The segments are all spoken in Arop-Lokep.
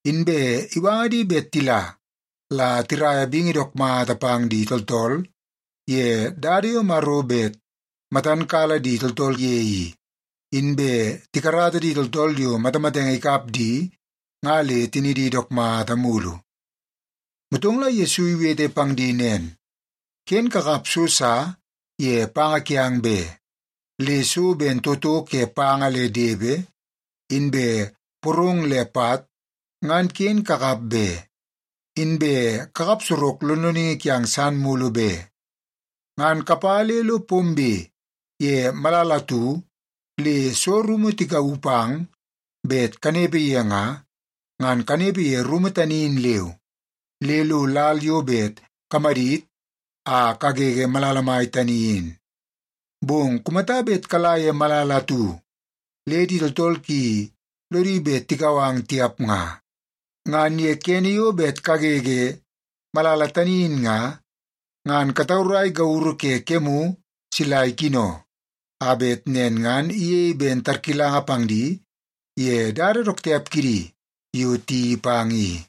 Inbe iwanga di bet tila la tiraia bingi dook mata pang di tooltool ye dada yo Maro bet matan kala di tooltool ye i, inbe tikarata di tooltool yo matamatenge ikap di nga le tinidi dook mata mulu. Motong la Yesu iwete pang di nen, “Ken kakap so sa ye panga kiang be. Le so ben toto ke panga le depe, inbe porong le pat, ngan ken kakap be. Inbe kakap sorok lonloningi kiang san mulu be. Ngan kapa le lo pombe ye malala atu le soo rumu tikauu pang bet kanepe ye nga, ngan kanepe ye rumu tani in leu, le lo lal yo bet kamadit a kagege malala mai tani in. Bong kumata bet kala ye malala atu le di tooltool ki lodi bet tikau ang tiap nga, ngan ye kene yo bet kagege malala tani in nga, ngan kataurai gauru ke kemu sila ikino, a bet nen ngan iyei ben tarkilanga pang di ye dada dook tiap kidi yo tiyeii pang i.”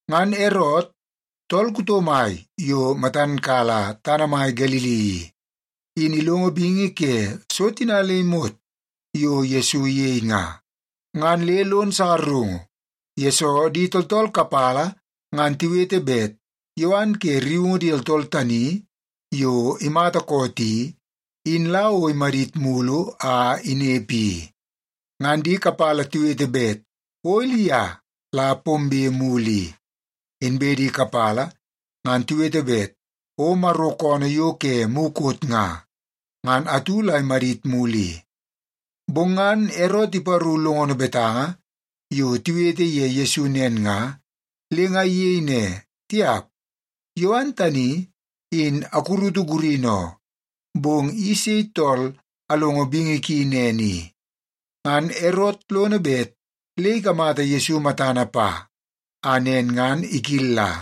Ngan Erot, tool kuto mai yo matan kala tana mai Galili i, in ilongo bingi ke so tina le imot yo Yesu iyei nga, ngan le lon sakarungu, yesoo di tooltool kapala ngan tiwete bet Yowan ke rriungu di tooltool tani yo imata koot i, in la o imadit mulu a inepe i. Ngan di kapala tiwete bet o Ilia la pombe mulu i, inbe di kapala ngan tiwete bet o Maro koonoo yo ke mukot nga, ngan atu la imadit mulu i. Bong ngan Erot iparu longono betanga yo tiwete ye Yesu nen nga, le nga iyei ne, “Tiap, Yowan tani, in akurutu gurini oo. Bong i sei tool alongo bingi ki nen i?” Ngan Erot lono bet le ikamata Yesu matana pa a nen ngan ikilla.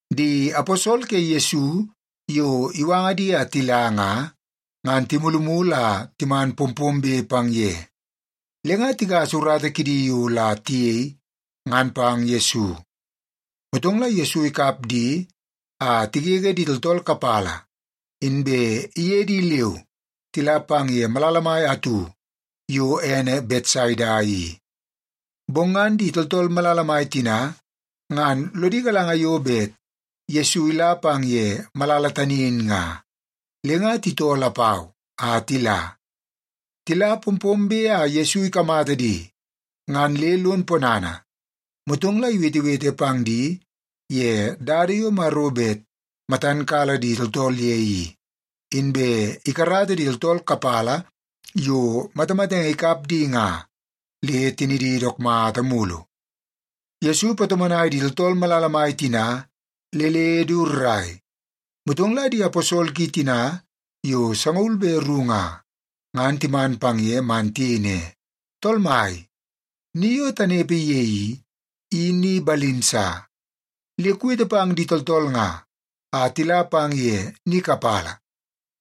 Di aposol ke Yesu yo iwanga di a tila nga, ngan timulumulu a timan pompombe pang ye, le nga tigasa urata kidi yo la tiyei, ngan pang Yesu. Motong la Yesu ikap di a tigege di tooltool kapala, inbe iye di leu tila pang ye malala mai atu yo ene Betsaida i. Bong ngan di tooltool malala mai tina ngan lodi galanga yo bet Yesu ila pang ye malala tani in nga, le nga titoo lapau a tila. Tila pompombe a Yesu ikamata di, ngan le lon ponana, motong la iwetewete pang di ye dada yo Maro bet matan kala di tooltool ye i, inbe ikarata di tooltool kapala yo matamatenge ikap di nga, le tinidi dook mata mulu. Yesu ipatomonai di tooltool malala mai tina le le du rrai. Motong la di aposol ki tina yo sangaul be ru nga, ngan timan pang ye man tiyei ne, “Tool Mai, ni yo tanepe ye i, i ni balim sa. Le kuwete pang di tooltool nga a tila pang ye ni kapala,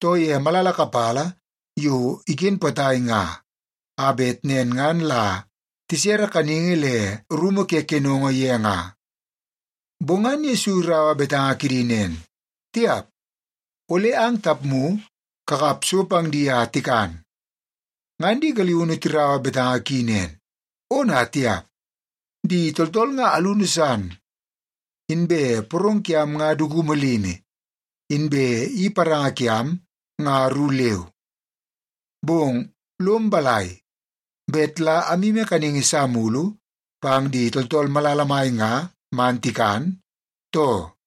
too ye malala kapala yo iken potai nga, a bet nen ngan la tisere kaningi le rumu ke kenongo ye nga.” Bong ngan Yesu iraua betanga kidi nen, “Tiap! Ole ang tapmu kakap so pang di a tikan.” Ngan di galiunu tiraua betanga ki nen, “Ona tiap! Di tooltool nga alunu san. Inbe porong kiam nga dukumu limi, inbe i paranga kiam nga ru leu. Bong lom balai, bet la amyimi kaningi sa mulu pang di tooltool malala mai nga man tikan, too?”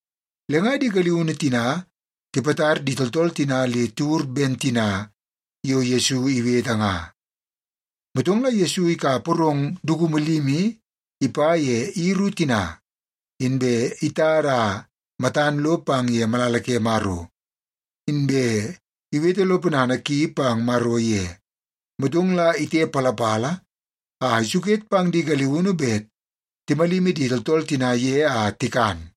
Le nga di galiunu tina tipatar di tooltool tina le tiwur ben tina yo Yesu iwete nga. Motong la Yesu ikap porong dukumu limi ipa ye i ru tina, inbe itada a matan lo pang ye malala ke Maro, inbe iwete lo ponana ki pang Maro ye. Motong la itepalapala a isuket pang di galiunu bet timalimi di tooltool tina ye a tikan.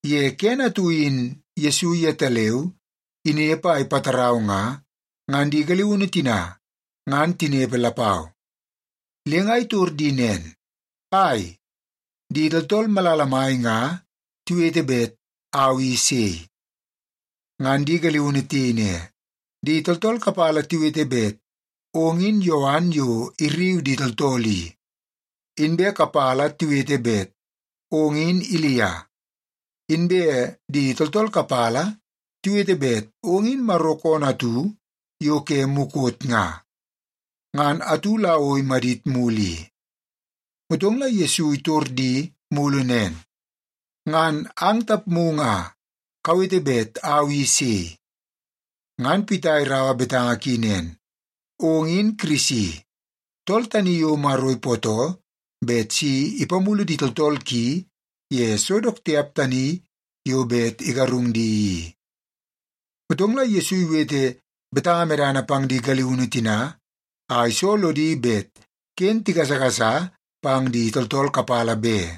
Ye kene atu in Yesu yetaleu inepe a ipatarau nga, ngan di galiunu tina ngan tinepe lapau. Le nga itor di nen, “Ai, di tooltool malala mai nga tiwete bet au i sei?” Ngan di galiunu tiyei ne, “Di tooltool kapala tiwete bet ong in Yowan yo irriu di tooltool i, inbe kapala tiwete bet ong in Ilia. Inbe di tooltool kapala tiwete bet ong in Maro koonoo atu yo ke mukot nga, ngan atu la o imadit mulu i.” Motong la Yesu itor di mulu nen, “Ngan ang tapmu nga, kawete bet au i sei?” Ngan Pita iraua betanga ki nen, “Ong in Kirisi, tool tani yo Maro ipootoo bet si ipamulu di tooltool ki ye so dook tiap tani yo bet igarung di i.” Motong la Yesu iwete betanga medana pang di galiunu tina a iso lodi bet ken tigasagasa pang di tooltool kapala be.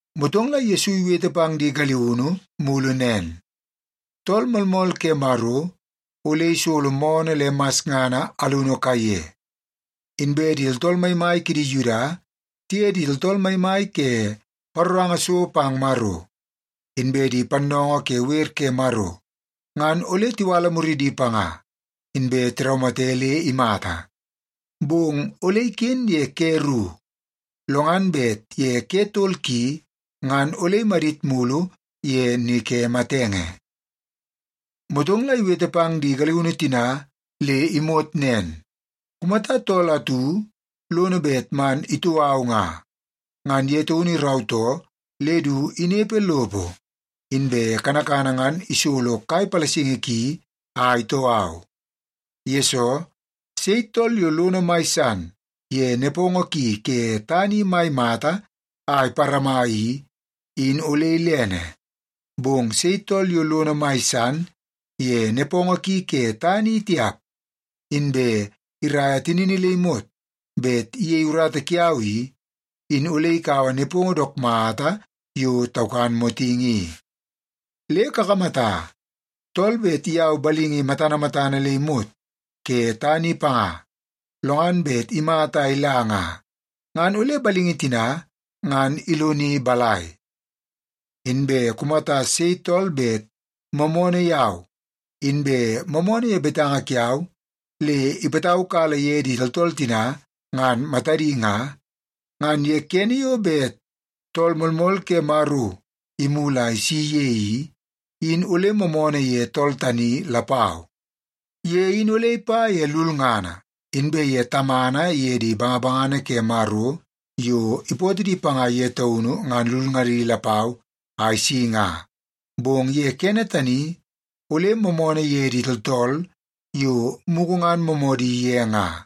Motong la Yesu iwete pang di galiunu mulu nen, “Tool Moolmool ke Maro ole isolo moonoo le masngana alunu kaiye. Inbe di tooltool maimai kidi Yuda tiye di tooltool maimai ke paroranga so pang Maro, inbe di pannoongoo ke wer ke Maro, ngan ole tiwala muridi panga, inbe tiraumate le imata. Bong ole iken ye ke ru, lo ngan bet ye ke tol ki ngan ole imadit mulu ye ni ke matenge.” Motong la iwete pang di galiunu tina le imot nen, “Kumata tool atu lono bet man itoo au nga, ngan ye taunu irautoo le du inepe lopo, inbe kanakana ngan isolo kai palasingi ki a itoo au. Yesoo, sei tool yo lono mai san ye nepongo ki ke tana i mai mata a iparama i, in ole ilene. Bong sei tool yo lono mai san ye nepongo ki ke tana i tiap, inbe iraia tinini le imot bet iyei urata kiau i, in ole ikaua nepongo dook mata yo taukan motingi i. Le kakamata, tool bet iyau balingi matana matana le imot ke tana i panga, lo ngan bet imata a ila nga, ngan ole balingi tina ngan iloni balai? Inbe kumata sei tool bet moomoonoo yau, inbe moomoonoo ye betanga kiau le ipataukala ye di tooltool tina ngan matadi nga, ngan ye kene yo bet Tool Moolmool ke Maro imulu a isi ye i, in ole moomoonoo ye tool tani lapau. Ye in ole ipa ye lulngana, inbe ye Tamana iye di bangabangana ke Maro yo ipootoo di panga ye taunu ngan lulngadi lapau a isi nga, bong ye kene tani ole moomoonoo ye di tooltool yo mugu ngan moomoodi ye nga.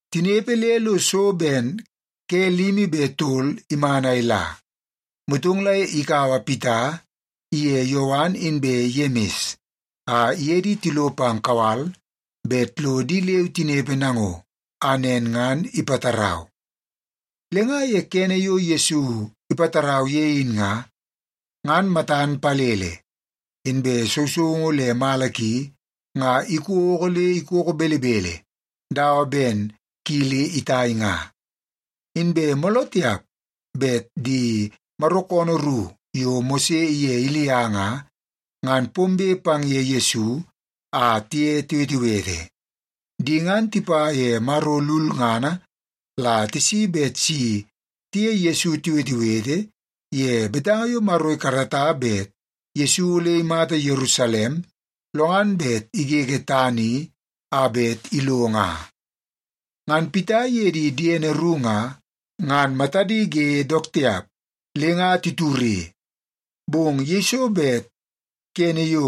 Tinepe le lo so ben ke limi be tol iman a ila, motong la ikaua Pita iye Yowan inbe Yemis a iye di tilo pang kawal bet lo di leu tinepe nango, a nen ngan ipatarau. Le nga ye kene yo Yesu ipatarau ye in nga, ngan matan palele, inbe sousoungu le mala ki nga ikoko le ikoko belebele dawa ben kili itai nga. Inbe mooloo tiap bet di Maro koonoo ru yo Mose iye Ilia nga, ngan pombe pang ye Yesu a tiye tiwetewete. Di ngan tipa ye Maro lulngana la tisi bet si tiye Yesu tiwetewete ye betanga yo Maro ikarata bet Yesu ole imata Yerusalem, lo ngan bet igege tana i a bet ilo nga. Ngan Pita iye di diene ru nga, ngan matadi ge dook tiap le nga titure. Bong yeiso bet kene yo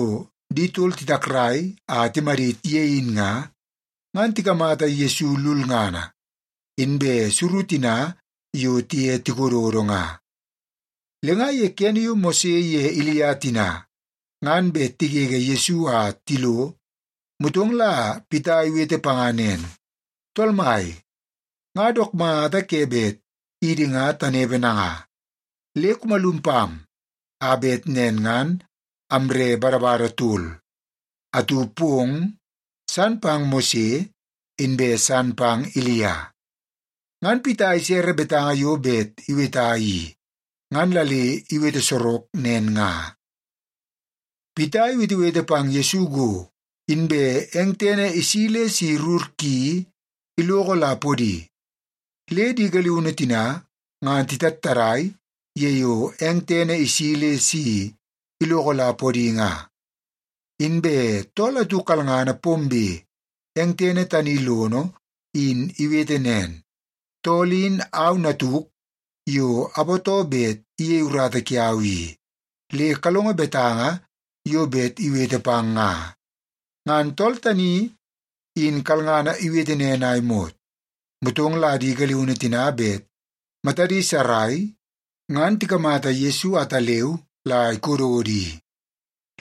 di tol titakrai a timadit ye in nga, ngan tikamata Yesu lulngana, inbe suru tina yo tiye tikododo nga. Le nga ye kene yo Mose ye Ilia tina ngan bet tigege Yesu a tilo, motong la Pita iwete panga nen, “Tool Mai, nga dook mata ke bet idi nga tanepe nanga. Le kumalum pam, a bet nen ngan amre badabada tol; atu pong, san pang Mose, inbe san pang Ilia.” (Ngan Pita isere betanga yo bet iweta i, ngan la le iwete sorok nen nga.) Pita iwetewete pang Yesu go, inbe eng tene isi le si rur ki iloko la podi, le di galiunu tina ngan titattadai ye yo eng tene isi le si iloko la podi nga. Inbe tool atu kalngana pombe eng tene tani lono in iwete nen, “Tool in au natuk yo apootoo bet iyei urata kiau i. Le kalongo betanga yo bet iwete pang nga!” Ngan tool tani in kalngana iwete nen a imot, motong la di galiunu tina bet matadi sarai ngan tikamata Yesu ataleu la ikododo i.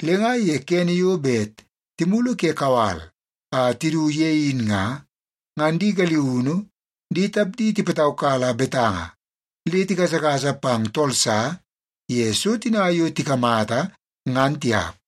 Le nga ye kene yo bet timulu ke kawal a tidu ye in nga, ngan di galiunu di tapdi tipataukala betanga le tigasagasa pang tool sa ye so tina yo tikamata, ngan tiap.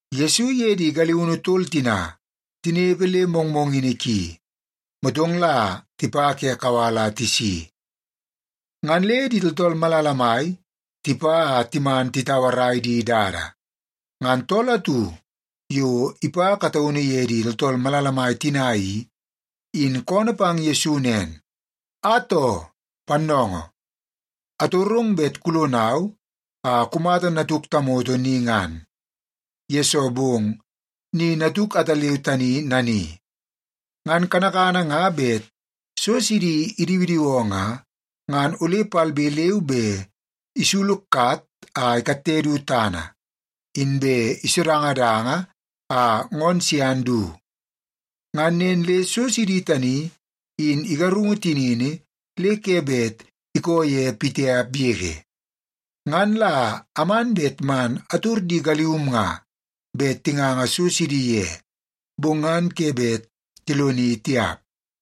Yesu iye di galiunu tol tina tinepe le mongmongini ki, motong la tipa ke kawal a tisi, ngan le di tooltool malala mai tipa a timan titauarai di dada. Ngan tool atu yo ipa kataunu ye di tooltool malala mai tina i, in koonoo pang Yesu nen, “Atoo, Pannoongoo, atorong bet kulonau a kumata natuk tamoto ni ngan, yesoo bong ni natuk ataleu tani nani. Ngan kanakana nga bet so sidi idiwidiwoo nga, ngan ole palbe leu be isulukat a ikatte du tana, inbe isodangadanga a ngoonoo sian du. Ngan nen le so sidi tani in igarungu tinini le ke bet ikoo ye pitiap yege. Ngan la aman bet man ator di galium nga bet tinganga so sidi ye, bong ngan ke bet tiloni tiap.”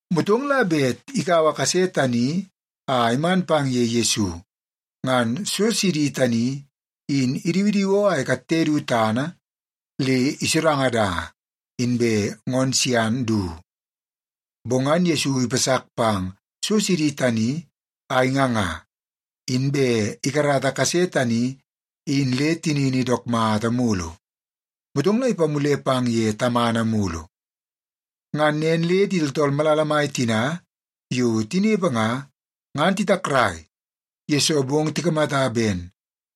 Motong la bet ikaua kase tani a iman pang ye Yesu, ngan so sidi tani in idiwidiwoo a ikatte du tana le isodangadanga, inbe ngoonoo sian du. Bong ngan Yesu ipasak pang so sidi tani a inganga, inbe ikarata kase tani in le tinini dook mata mulu. Motong la ipamule pang ye tamana mulu. Ngan nen le di tooltool malala mai tina yo tinepe nga, ngan titakrai, yesoo bong tikamata ben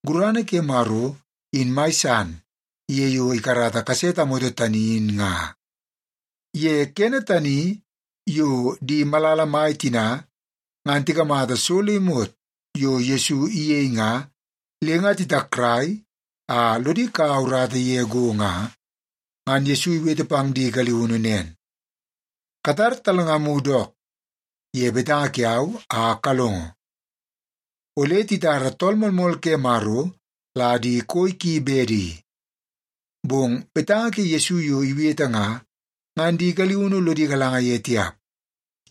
gurana ke Maro in mai san ye yo ikarata kase tamoto tani in nga. Ye kene tani yo di malala mai tina ngan tikamata so le imot yo Yesu iyei nga le nga titakrai a lodi kaua urata ye go nga, ngan Yesu iwete pang di galiunu nen, “Katar talngamu dook ye betanga kiau a kalongo. Ole titara Tool Moolmool ke Maro la di koi ki bedi.” Bong betanga ke Yesu yo iwete nga, ngan di galiunu lodi galanga ye tiap.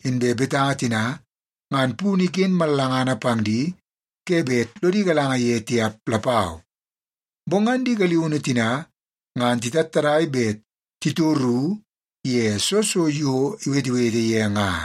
Inbe betanga tina ngan punu iken mallangana pang di ke bet lodi galanga ye tiap lapau. Bong ngan di galiunu tina ngan titattadai bet titoru ye soo so yo iwetewete ye nga.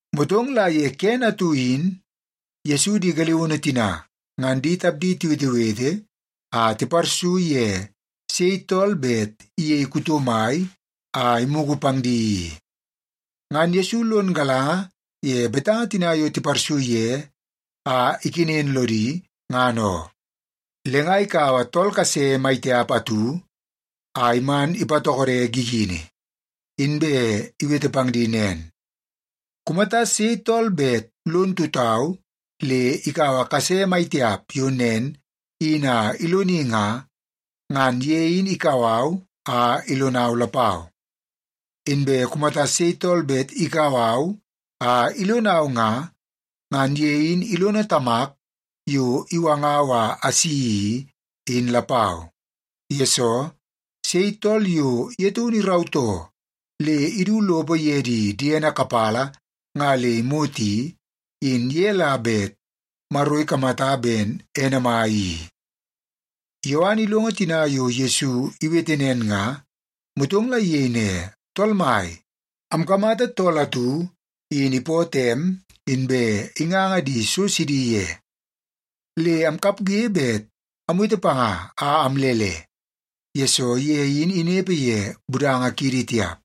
Motong ye kene atu in Yesu di galiunu tina ngan di tapdi tiwetewete a tiparsu ye sei tool bet iyei kuto mai a imugu pang di i. Ngan Yesu lon galanga ye betanga tina yo tiparsu ye a ikenen lodi ngan oo. Le nga ikaua tool kase mai tiap atu a iman ipatokode gigini. Inbe iwete pang di nen, “Kumata sei tool bet lon tutau le ikaua kase maitiap yo nen in a iloni nga, ngan ye in ikau au a ilonau lapau. Inbe kumata sei tool bet ikau au a ilonau nga, ngan ye in ilono Tamak yo iwangau a asi i, in lapau. Yesoo, sei tool yo ye taunu irautoo le idu lopo ye di diene kapala nga le imot i, in ye la bet Maro ikamata ben ene mai i.” Yowan ilongo tina yo Yesu iwete nen nga, motong la iyei ne, “Tool mai, amkamata tool atu in ipootoo em, inbe inganga di so sidi ye. Le amkapge bet amwete panga a amlele, yesoo ye in inepe ye budanga kiidi tiap.”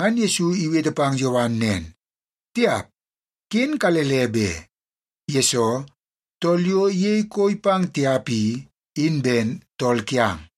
Ngan Yesu iwete pang Yowan nen, “Tiap, ken kalele be! Yesoo, tool yo iyei koi pang tiap i, in ben tool kiang.”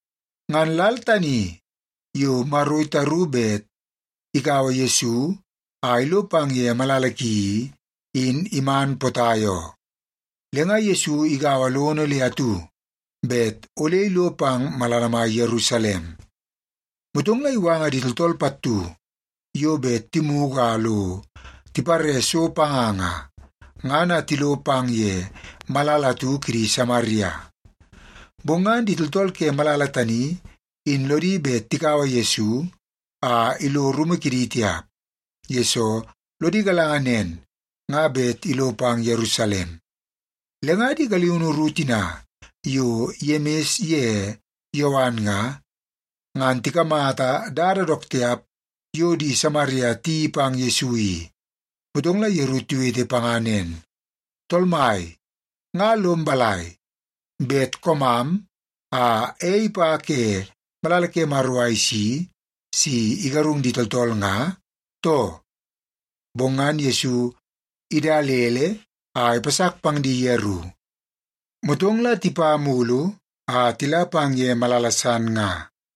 Ngan lal tani yo Maro itaru bet ikaua Yesu a ilo pang ye malala ki i, in iman potai oo. Le nga Yesu igaua lono le atu bet ole ilo pang malala mai Yerusalem. Motong la iwanga di tooltool pattu yo bet timugu a lo tipare so panga nga, ngan a tilo pang ye malala atu kidi Samaria. Bong ngan di tooltool ke malala tani in lodi bet tikaua Yesu a ilo rumu kidi tiap, yesoo lodi galanga nen nga bet ilo pang Yerusalem. Le nga di galiunu ru tina yo Yemis ye Yowan nga, ngan tikamata dada dook tiap yo di Samaria tiyeii pang Yesu i, motong la yeru tiwete panga nen, “Tool mai, nga lom balai, bet koomam a ei ipa ke malala ke Maro a isi si igarung di tooltool nga, too?” Bong ngan Yesu idalele a ipasak pang di yeru. Motong la tipa mulu a tila pang ye malala san nga.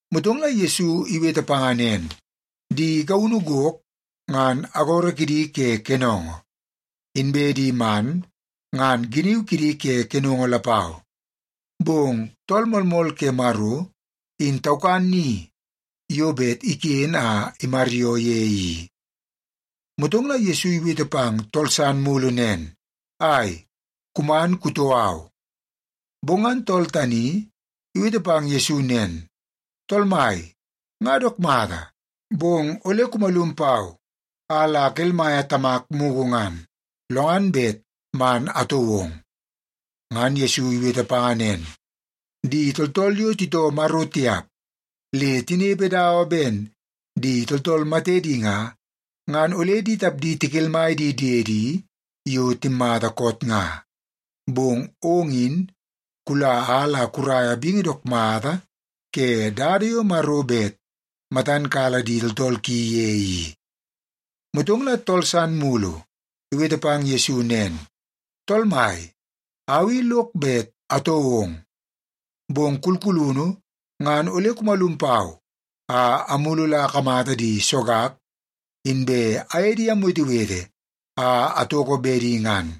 Motong la Yesu iwete panga nen, “Di gaunu gok ngan agoro kidi ke kenongo, inbe di man ngan giniu kidi ke kenongo lapau, bong Tool Moolmool ke Maro, in taukan ni yo bet iken a imaryoo ye i.” Motong la Yesu iwete pang tool san mulu nen, “Ai, kuman kutoo au.” Bong ngan tool tani iwete pang Yesu nen, “Tool Mai, nga dook mata, bong ole kumalum pau a la akelmaia tamak mugu ngan, lo ngan bet man atoo ong.” Ngan Yesu iwete panga nen, “Di tooltool yo titoo Maro tiap le tinepe dawa ben di tooltool matedi nga, ngan ole di tapdi tikelmai di diedi yo timmata koot nga. Bong ong in kula a la kuraia bingi dook mata ke dada yo Maro bet matan kala di tooltool ki ye i.” Motong la tool san mulu iwete pang Yesu nen, “Tool Mai, au i lok bet atoo ong. Bong kulkulunu ngan ole kumalum pau a amulu la akamata di sogak, inbe aye di amwetewete a atoko bedi ngan.”